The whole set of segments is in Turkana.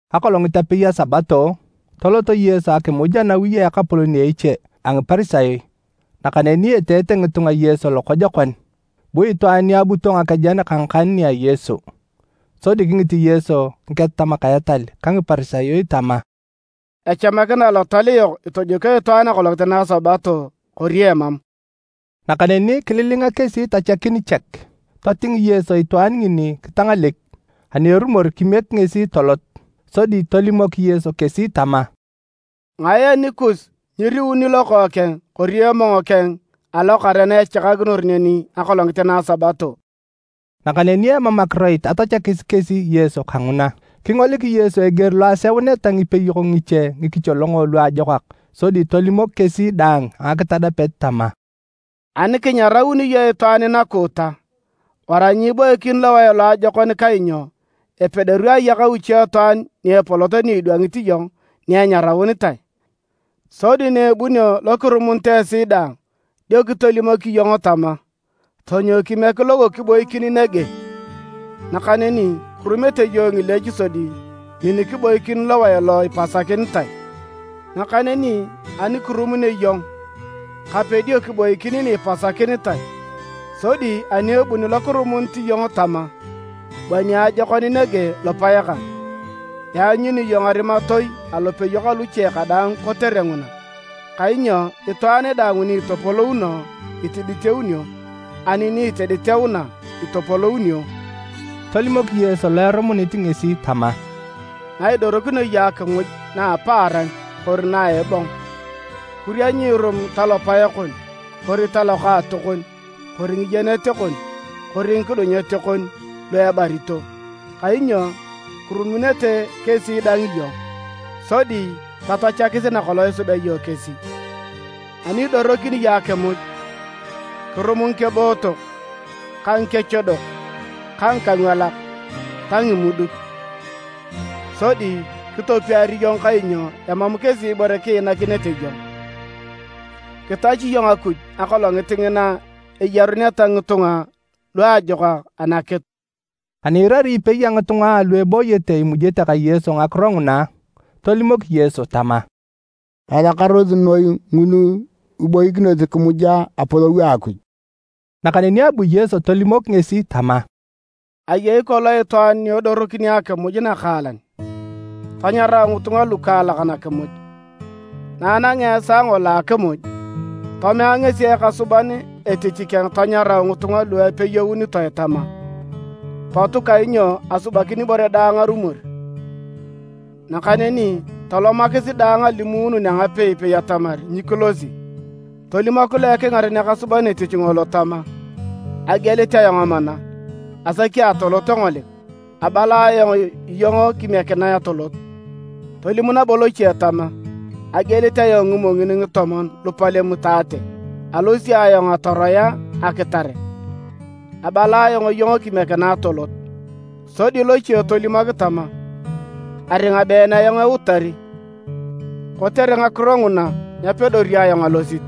Akolongit apei a Sabato, tolot Yesu akimuj anawi a ekapolon a eche a Ngiparisayo, nakaneni eteete ngitunga Yesu lokojokon. Bu itwaan ni abuto ngakejen ka ngakan nia Yesu. Sodi kingit Yesu Ngiketatamak a etal ka Ngiparisayo tama, “Echamakina alotal yok itojokio itwaan akolongit na a Sabato, kori emam?” Nakaneni kililinga kesi tachakin chek. Toting Yesu itwaan ngini kitangalek, ani erumor kimiek ngesi tolot. Sodi tolimok Yesu kesi tama, “Ngae anikus nyiriuni lokookeng kori emong keng alokare na echakakinor neni akolongit na a Sabato?” Nakaneni emam akiroit atachakis kesi Yesu kanguna. Kingolik Yesu eger lo aseuneta ngipeyok ngiche ngikicholongo luajokak sodi tolimok kesi daang a ngakitadapet tama: “Ani kinyarauni iyong itwaan nakuuta, wara nyiiboikin lowae loajokon kainyo epedori ayakau itwaan iche ni epolot ni kidwangit iyong ni enyaraunitae, sodi na ebunio lo kirumunit esi daang, dio kitolimok iyong tama, ‘Tonyou kimiek lo kiboikin nege.’ Nakaneni kirumete iyong ngileech sodi min kiboikin lowae lo ipasakinitae, nakaneni ani kirumunio iyong, kape dio kiboikin ni ipasakinitae, sodi ani ebuni lokirumunit iyong tama, ‘Bua niajokon nege lopae kang’, ianyuni iyong arimatoi alopeyok aluche kadaang kotere nguna. Kainyo itwaan daang ni itopolouno, itiditeunio, ani ni itiditeuna, itopolounio.” Tolimok Yesu lo erumunit ngesi tama, “Naidorokinio iyong akimuj na apaaran kori na a ebong, kuria nyiirum talopae kon kori talokaatokon kori ngiyenet kon kori ngikudunyet kon lu ebarito, kainyo kirumunete kesi dang iyong, sodi tatachakis nakolong isubea iyong kesi. Ani idorokini iyong akimuj, kirum ngikebootok ka ngikechodok ka ngikangwalak ta ngimuduk. Sodi kitopiar iyong kainyo emam kesi ibore kiinakinete iyong. Kitachi iyong Akuj akolongit ngina eyaruneta ngitunga luajokak anakitu.” Ani iirari ipei a ngitunga alu ebooyete imujete ka Yesu ngakiro nguna, tolimok Yesu tama, “Elakarosi noi ngulu iboikinosi kimuja Anapolou a Akuj!” Nakaneni abu Yesu tolimok ngesi tama, “Ayei kolong itwaan ni edorokini akimuj nakaalan, tanyarau ngitunga lukaalak nakimuj. Na anangea esaa ngolo a akimuj, tomea ngesi ekasuban etich keng tanyarau ngitunga lu epeyounitoe tama, ‘Potu kainyo asubakin ibore daang arumor!’ Nakaneni tolomakis daang alimuunun a ngapei-pei atamar nyikilosi! Tolimok lo ekingaren ekasuban etich ngolo tama, ‘Agielit ayong amana, asaki atolot engolik. Abala ayong iyong kimiekinae atolot.’ Tolim nabo loche tama, ‘Agielit ayong ngimongin ngitomon lupalem itaate, alosi ayong atoroea akitare, abala ayong iyong kimiekinae atolot.’ Sodi loche tolimok tama, ‘Aringa been ayong eutari, kotere ngakiro nguna nyapedori ayong alosit.’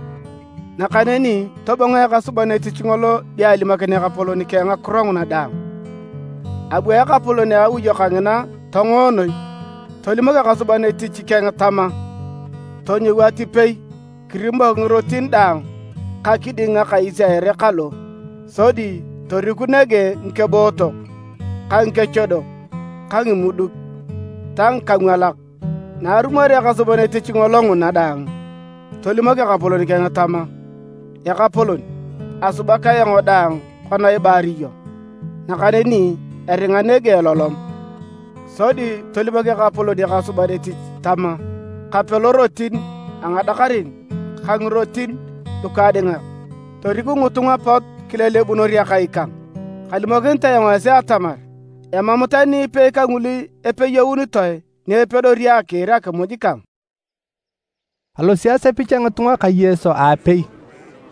Nakaneni tobongo ekasuban etich ngolo dio alimokin ekapolon keng ngakiro nguna daang. Abu ekapolon a awi kangina tongo noi tolimok ekasuban etich keng tama, ‘Tonyou atipei kirimok ngirotin daang ka kiding ngakais a ere kalo, sodi toriku nege ngikebootok ka ngikechodok ka ngimuduk ta ngikangwalak.’ Na arumorea ekasuban etich ngolo nguna daang, tolimok ekapolon keng tama, ‘Ekapolon, asubak ayong daang kona ibaar iyong, nakaneni eringa nege elolom.’ Sodi tolimok ekapolon ekasuban etich tama, ‘Kape lorotin a ngadakarin ka ngirotin lukaadingak, toriku ngitunga pot kilelebunor akai kang. Kalimokinit ayong esi atamar, emam tani ipei kangulu epeyounitoe ni epedori akiir akimuj kang!’” Alosi asepich a ngitunga ka Yesu aapei.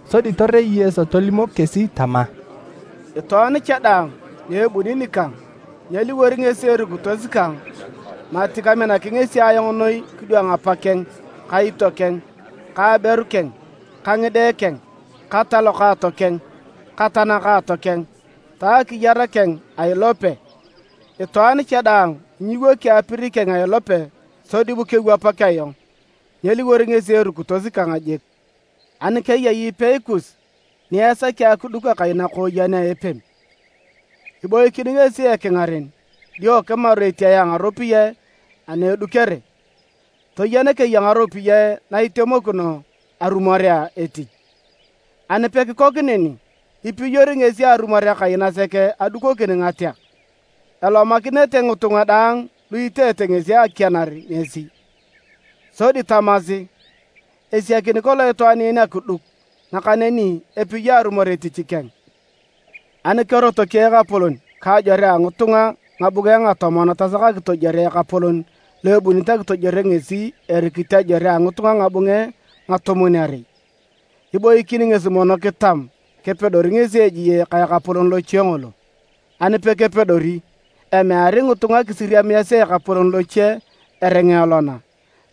Sodi torei Yesu tolimok kesi tama, “Itwaan cha daang ni ebuni nikang nyeliwor ngesi erukitos kang mati kaminaki ngesi ayong noi kidwang apakeng ka itiokeng ka aberu keng ka ngide keng ka talokaato keng ka tanakaato keng ta akiyar keng a ilope. Itwaan cha daang ni nyiwoki apir keng a ilope sodi bu kewapak ayong, nyeliwor ngesi erukitos kang jik. “Ani keyei ipei kus ni esaki akiduk akai nakooyen a epem, iboikin ngesi ekingaren dio kimaru etiae a ngaropiyae a na edukere, toyen keya ngaropiyae na itemokino arumorea etich. Ani pekikok neni, ipiyori ngesi arumor akai nasek adukokin ngateak. Elomakinete ngitunga daang lu iteete ngesi akianar ngesi. Sodi tamasi, ‘Esiakini kolong itwaan en akiduk, nakaneni epiyo arumor etich keng!’ Ani kerotoki ekapolon ka ajore a ngitunga ngabunge ngatomon tasak akitojwore ekapolon lo ebunit akitojuore ngesi erikit ajore a ngitunga ngabunge ngatomwon-arei, iboikin ngesi mono kitam kepedori ngesi ejie ka ekapolon loche ngolo. Ani pekepedori, emeari ngitunga kisiriamiasi ekapolon loche eringa elona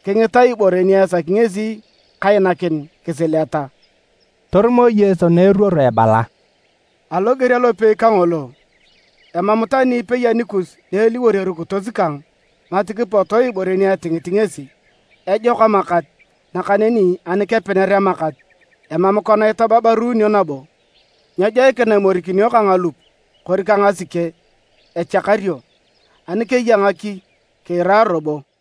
kingita ibore ni esaki ngesi kainakin kisileta.” Torumo Yesu na eruoro ebala, “Aloger alopei kangolo, emam tani ipei anikus ni eliwor erukitos kang mati kipoto ibore ni etingit ngesi. “Ejok amakat, nakaneni ani kepener amakat, emam kona itababaruunio nabo. Nyejoikina imorikinio ka ngalup kori ka ngasike, echakario. Ani keya ngaki, kiira robo!”